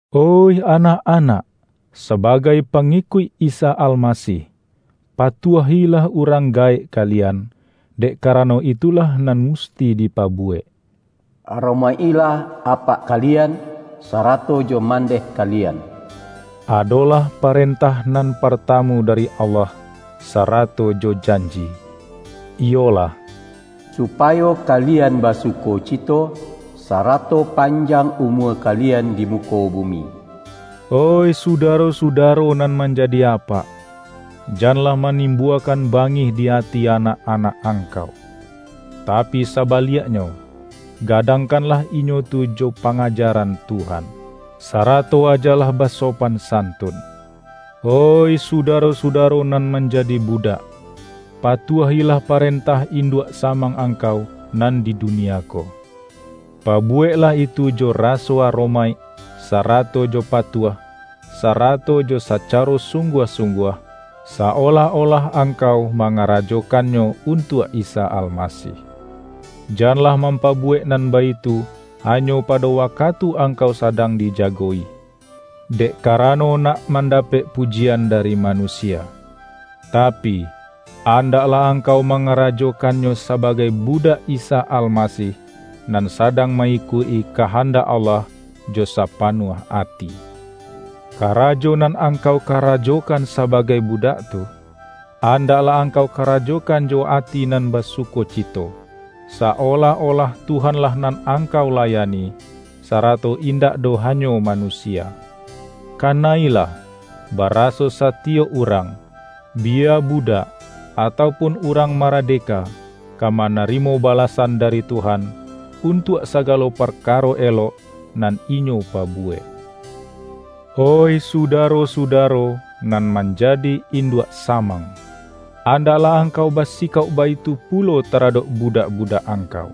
Oih anak-anak! Sabagai pangikuik Isa Almasih, patuahilah urang ga-ek kalian, dek karano itulah nan musti dipabuwek. ”Aromaik-ilah apak ka-lian, sarato jo mandeh kalian” adolah parentah nan partamu dari Allah sa-rato jo janji, iyolah:”Supayo kalian basukocito, sarato panjang umua ka-lian di muko bumi”. Oih sudaro-sudaro nan manjadi apak! Janlah manimbuakan bangih di ati anak-anak angkau. Tapi saba-liaknyo, gadangkanlah inyo tu jo pa-ngajaran Tuhan, sarato ajalah baso-pan santun. Oih sudaro-sudaro nan manjadi budak! Patuahilah parentah induak samang angkau nan di dunia ko. Pa-buweklah itu jo raso aromaik, sarato jo patuah, sarato jo sacaro sungguah-sungguah, sa-olah-olah angkau ma-ngarajokannyo untuak Isa Almasih. Janlah mampabuwek nan baitu ha-nyo pado wakatu angkau sadang dija-go-i, dek karano nak mandapek pujian dari manusia. Tapi, andaklah angkau mangarajokannyo sabagai budak Isa Almasih, nan sadang ma-ikuik-i ka-handak Allah jo sapanuah ati. Karajo nan angkau karajokan sabagai budak tu, andaklah angkau karajokan jo ati nan basukocito, sa-olah-olah Tuhan-lah nan angkau layani, sarato indak doh hanyo manusia. Kana-ilah, bara-so satiyok urang, biya budak atau pun urang maradeka, ka manarimo bala-san dari Tuhan, untuak sagalo parka-ro elok nan inyo pabuwek. Oih sudaro-sudaro, nan manjadi in-duak samang! Andaklah angkau basi-kauk baitu pulo taradok budak-budak angkau.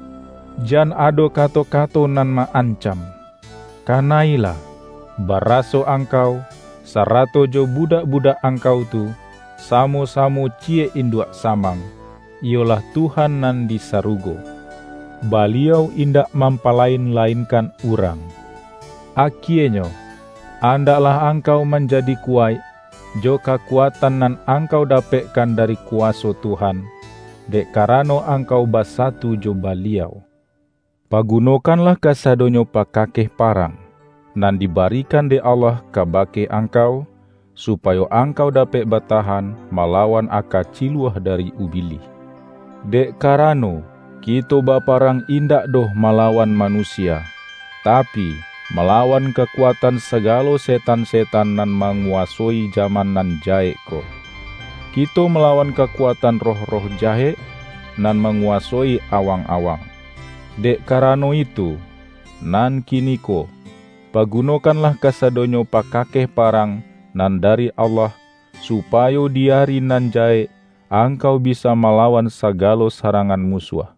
Jan ado kato-kato nan ma-an-cam. Kana-ilah, baraso angkau, sarato jo budak-budak angkau tu, samo-sa-mo ciyek induak samang, iyolah Tuhan nan di sarugo. Baliau indak mampa-lain-lainkan urang. Akienyo, andaklah angkau man-jadi kuwaik, jo kakuatan nan angkau dapekkan dari kuwaso Tuhan, dek ka-rano angkau basatu jo Baliau. Pagu-nokanlah kasadonyo pakakeh parang, nan dibarikan dek Allah kabake ang-kau, supayo angkau dapek batahan ma-lawan aka ciluah dari Ubilih. Dek karano, kito baparang indak doh ma-lawan manusia, tapi, malawan kakuat-an sagalo setan-setan nan manguwasoi jaman nan jahek ko. Kito malawan ka-kuatan roh-roh jahek, nan manguwa-soi awang-awang. Dek karano itu, nan kiniko, pagunokanlah kasadonyo pakakeh parang nan dari Allah, supa-yo di ari nan jahek angkau bisa mala-wan sagalo sarangan musuah.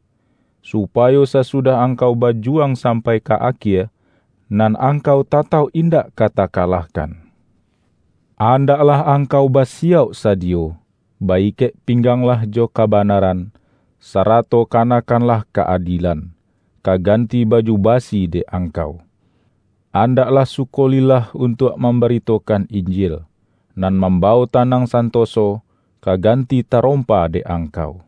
Supa-yo sasudah angkau bajuwang sampai ka akie, nan angkau tatauk indak ka takalahkan. Andaklah angkau basiyauk sadiyo. Ba-ikek-pingganglah jo kabanaran, sa-rato kanakkanlah ka-adielan, ka gan-ti baju basi dek angkau. Andaklah sukolillah untuak mambaritokan In-jil, nan mambawok tanang santoso, ka ganti tarompa dek angkau.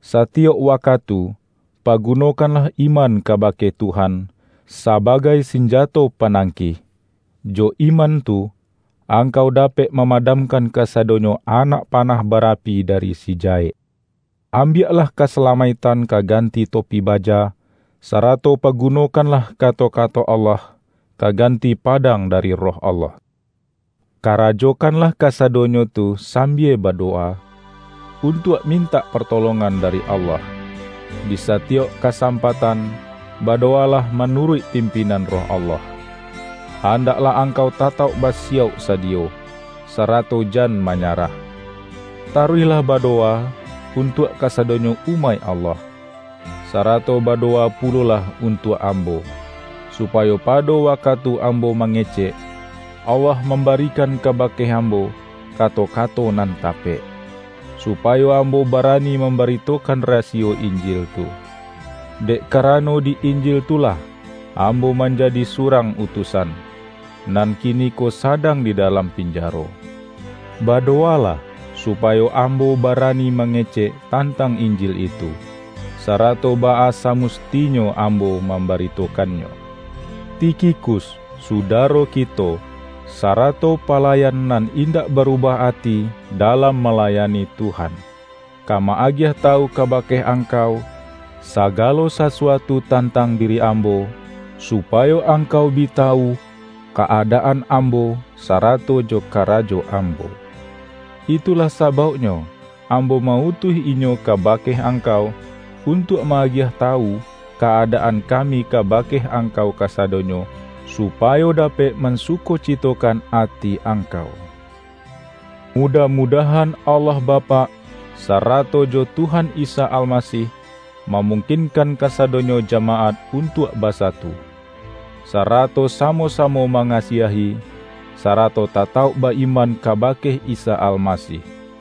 Satiyok wakatu, pagunokanlah iman kabake Tuhan, sabagai sinjato panangkih; jo iman tu, angkau dapek mamadamkan kasadonyo anak panah barapi dari si jahek. Ambiaklah kasalamaiktan ka ganti topi baja, sarato pagunokan-lah kato-kato Allah, ka ganti padang dari Roh Allah. Karajokanlah kasadonyo tu sambia badowa, untuak mintak partolongan dari Allah. Di sa-tiyok kasampatan badowalah manu-ruik pimpinan Roh Allah. Andaklah angkau tatauk basiyauk sadiyo, sara-to jan manyarah. Taruihlah badowa untuak kasadonyo umaik Allah. Sa-rato badowa pulolah untuak ambo, supayo pado wakatu ambo mange-cek, Allah mambarikan kabake am-bo kato-kato nan tapek. Supayo am-bo barani mambaritokan rasiyo Injil tu. Dek karano di Injil tu lah, am-bo manjadi surang utusan, nan kini-ko sadang di dalam pinjaro. Badowa-lah, supayo ambo barani mangecek tantang Injil itu, sarato baa samusti-nyo ambo mambaritokannyo. Tikhikus, sudaro kito, sarato pa-layan nan indak barubah ati dalam malayani Tuhan, ka ma-agiah tawu kabake angkau, sagalo sasuatu tan-tang diri ambo, supayo angkau bi ta-wu ka-adaan ambo, sarato jo kara-jo ambo. Itulah sabauknyo ambo ma-utuih inyo kabake angkau, untuak ma-agiah tawu ka-adaan kami kaba-ke angkau kasadonyo, supayo dapek mansukocitokan ati angkau. Mudah-mudahan Allah Bapak, sa-rato jo Tuhan Isa Almasih, mamungkin-kan kasadonyo jamaat untuak basatu, sarato samo-samo mangasiahi, sarato tatauk ba-iman kabake Isa Almasih.